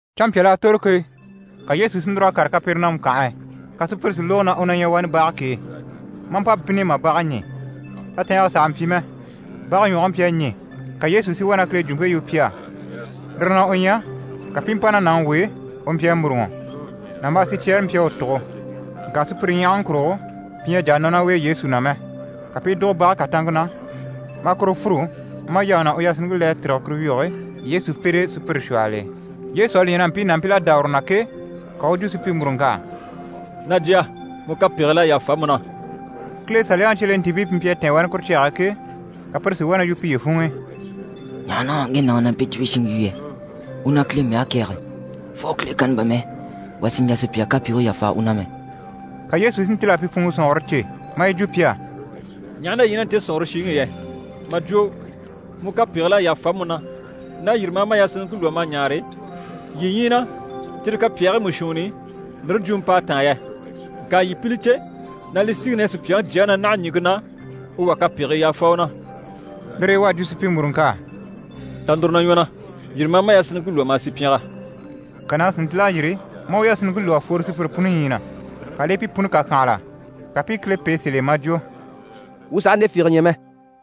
Canmpyal'à tòro ke, ka Yesu si núr'a kàre Kapɛrɛnamu kànhe e. Ka sùpyire si lógo na u ɲyɛ wani bage k'e, maa mpa bínni mà bage ɲî. Tatɛɛngɛ sàha mpyi mɛ, bage ɲwɔge mpyi a ɲî. Ka Yesu si wá na Kile jwumpe yu pi á. Lire na u ɲyɛ, ka pi i mpa ná yaŋi w'e, u mpyi a mûruŋɔ. Nàmbaa sicyɛɛre mpyi a u tugo. Ŋka sùpyire ɲyahaŋi kurugo, pi ɲyɛ a jà a nɔ ná u e Yesu na mɛ. Ka pi i dùgo bage kàtanŋke na, maa kuru fûru, maa yaŋi ná u yasinniŋke le a tîrige kuru wyige e Yesu fere e sùpyire shwɔhɔl'e. Yesu à li ɲya na mpii nàmpil'à dá uru na ke, ka u u jwo supyimuruŋk'á: «Na jya, mu kapegigil'à yàfa mu na.» Kile Saliyaŋi cyelentiibii pi mpyi a tɛ̀ɛn wani kuru cyage e ke, ka pire si wá na yu piye funŋ'i: «Ɲaha na ŋge nàŋi ɲyɛ na mpe jwumpe shiŋi yu yɛ? U na Kile mɛge kɛ̀ɛge. Fo Kile kanni bà mɛ, wà sì n‑jà sùpya kapegii yàfa u na mɛ!» Ka Yesu si ntíl'a pi funŋɔ sɔ̀nŋɔre cè, maa yi jwo pi á: «Ɲaha na yii ɲyɛ ná nte sɔ̀nŋɔre shiŋi i yɛ? Mà jwo “Mu kapegigil'à yàfa mu na” ná “Yîri, ma a ma yasinniŋke lwɔ́ ma a ɲaare” yii ɲyii na cyire kapyaagii mú shuunni i ndire jwumɔ p'à táan yɛ? Ŋka yii pi li cè na li síŋi na ɲyɛ Supyaŋi Jyaŋi na, naha ɲìŋke na, u wà kapegii yàfa u na.» Lire e u à jwo supyimuruŋk'á: «Ta núru na ɲwɔ na, yîri ma a ma yasinniŋke lwɔ́, ma a sì pyɛngɛ.» Ka nàŋi si ntíl'a yîri, maa u yasinniŋke lwɔ́ mà fworo sùpyire puni ɲyii na, ka li i pi puni kàkyanhala, ka pi i Kile pêe sèl'e, maa jwo: «Wuu sàha nde fiige ɲya mɛ!»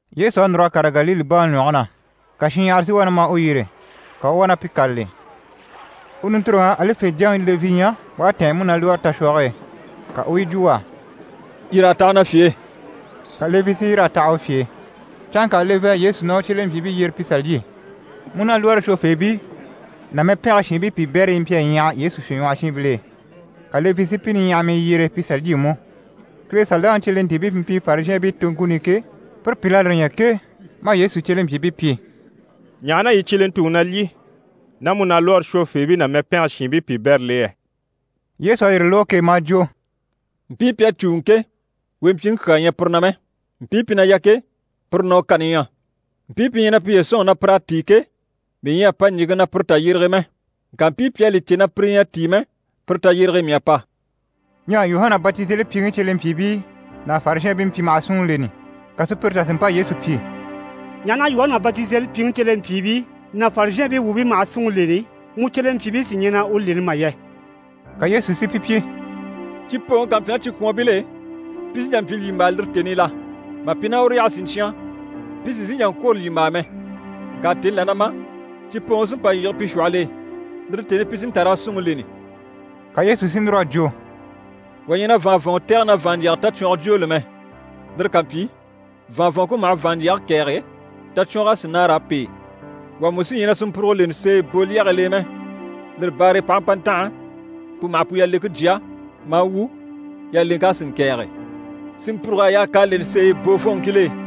Yesu à núr'a kàre Galile baŋi ɲwɔge na. Ka shinɲyahara si wá na ma u yyére, ka u u wá na pi kâlali. U nintoroŋ'à Alife jyaŋi Levi ɲya u à tɛ̀ɛn múnalwɔɔre tashwɔge e. Ka u u yi jwo u á: «Yîr'a taha na fye e». Ka Levi si yîr'a taha u fye e. Canŋka Levi à Yesu ná u cyelempyiibii yyere pi sà lyî. Múnalwɔɔre shwofeebii ná mɛpɛngɛ shiinbii piibɛrii mpyi a ɲyaha Yesu fyèɲwɔhɔshiinbil'e, ka Levi si pi niɲyahamii yyere pi sà lyî mú. Kile Saliyaŋi cyelentiibii pi mpyi Farizhɛɛnbii toŋkuni i ke, pire pìl'à lire ɲya ke, maa Yesu cyelempyiibii pyi: «Ɲaha na yii cyelentuŋi na lyî ná múnalwɔɔre shwofeebii ná mɛpɛngɛ shiinbii piibɛril'e yɛ?» Yesu à yire lógo ke, maa jwo: «Mpii pi à cùuŋɔ ke, wempyiŋi kyaa ɲyɛ pire na mɛ, mpii pi na yà ke, pire na u kani ɲyɛ. Mpii pi ɲyɛ na piye sɔ̂nŋi na pir'à tíi ke, mii ɲyɛ a pa ɲìŋke na pire tayyerege e mɛ. Ŋka mpii pi à li cè na pire ɲyɛ a tíi mɛ, pire tayyerege e mii à pa.» Ɲyɛ Yuhana Batizelipyiŋi cyelempyiibii ná Farizhɛɛnbii mpyi maha súnŋi leni, ka sùpyire tà si mpa Yesu pyi: «Ɲaha na Yuhana Batizelipyiŋi cyelempyiibii ná Farizhɛɛnbii wuubii maha súnŋi leni, mu cyelempyiibii sí ɲyɛ na u leni mà yɛ?» Ka Yesu si pi pyi: «Cipooŋi ká mpyi ná cikwɔnbil'e, pi sí n‑jà n‑pyi lyìmbaa lire tèni i la? Mà pi ná uru yaha siɲcyan pi sì n‑sìi n‑jà n‑kwôro lyìmbaa mɛ. Ŋka tèni là na ma, cipooŋi sí n‑pa n-yige pi shwɔhɔl'e. Lire tèni i pi sí n‑ta raa súnŋi leni.» Ka Yesu si núr'a jwo: «Wà ɲyɛ na vàanvɔnŋɔ tɛ̀gɛ na vàanɲjyɛga tacwɔngɔ jwooli mɛ. Lire ká mpyi, vàanvɔnŋke maha vàanɲjyɛge kɛ̀ɛge, tacwɔng'a sì nâara a pêe. Wà mú sí ɲyɛ na sinmpurugo leni seeye boolyɛgil'e mɛ. Lire baare e p'aha mpa ntanha, pu maha pu yaleŋke jya, maa wu, yaleŋk'a sì ŋkɛ̀ɛge. Sinmpurug'à yaa k'a leni seeyi boofɔnŋkil'e!»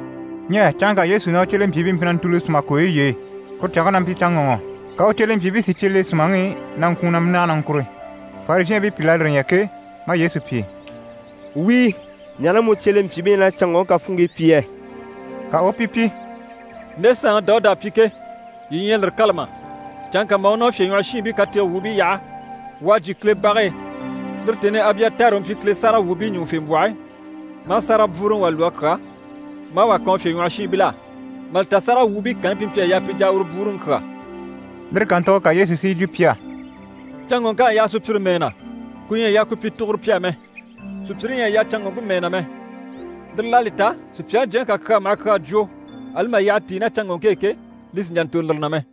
Ɲyɛ canŋka Yesu ná u cyelempyiibii mpyi na ntùuli sùma kooyi y'e. Kuru canŋke na mpyi canŋɔŋɔ. Ka u cyelempyiibii si cye le sùmaŋi i na ŋkwùun na mínage na ŋkùru. Farizhɛɛnbii pìl'à lire ɲya ke, maa Yesu pyi: «Wíi, ɲaha na mu cyelempyiibii na canŋɔŋke kafuunŋkii pyi yɛ?» Ka u u pi pyi: «Nde saanŋi Dawuda à pyi ke, yii ɲyɛ a lire kâla mà? Canŋka mà u ná u fyèɲwɔhɔshiinbii katege wuubii yaha, u à jyè Kile bage e, lire tèni i Abyatari u mpyi Kile sáragawwuubii ɲùŋufembwɔhe, maa sárage bwúuruŋi wà lwɔ́ a kyà, maa wà kan u fyèɲwɔhɔshiinbil'á. Mà li ta sáragawwuubii kanni pi mpyi a yaa pi jà a uru bwúuruŋi kyà.» Lire kàntugo ka Yesu si yi jwo pi á: «Canŋɔŋk'à yaa sùpyire mɛɛ na, ku ɲyɛ a yaa ku pyi tuguro pi á mɛ. Sùpyire ɲyɛ a yaa canŋɔŋke mɛɛ na mɛ. Lire l'à li ta Supyaŋi Jyaŋi ká kyaa maha kyaa jwo ali mà yyaha tíi ná canŋɔŋke e ke, li sì n‑jà n‑tòro lire na mɛ.»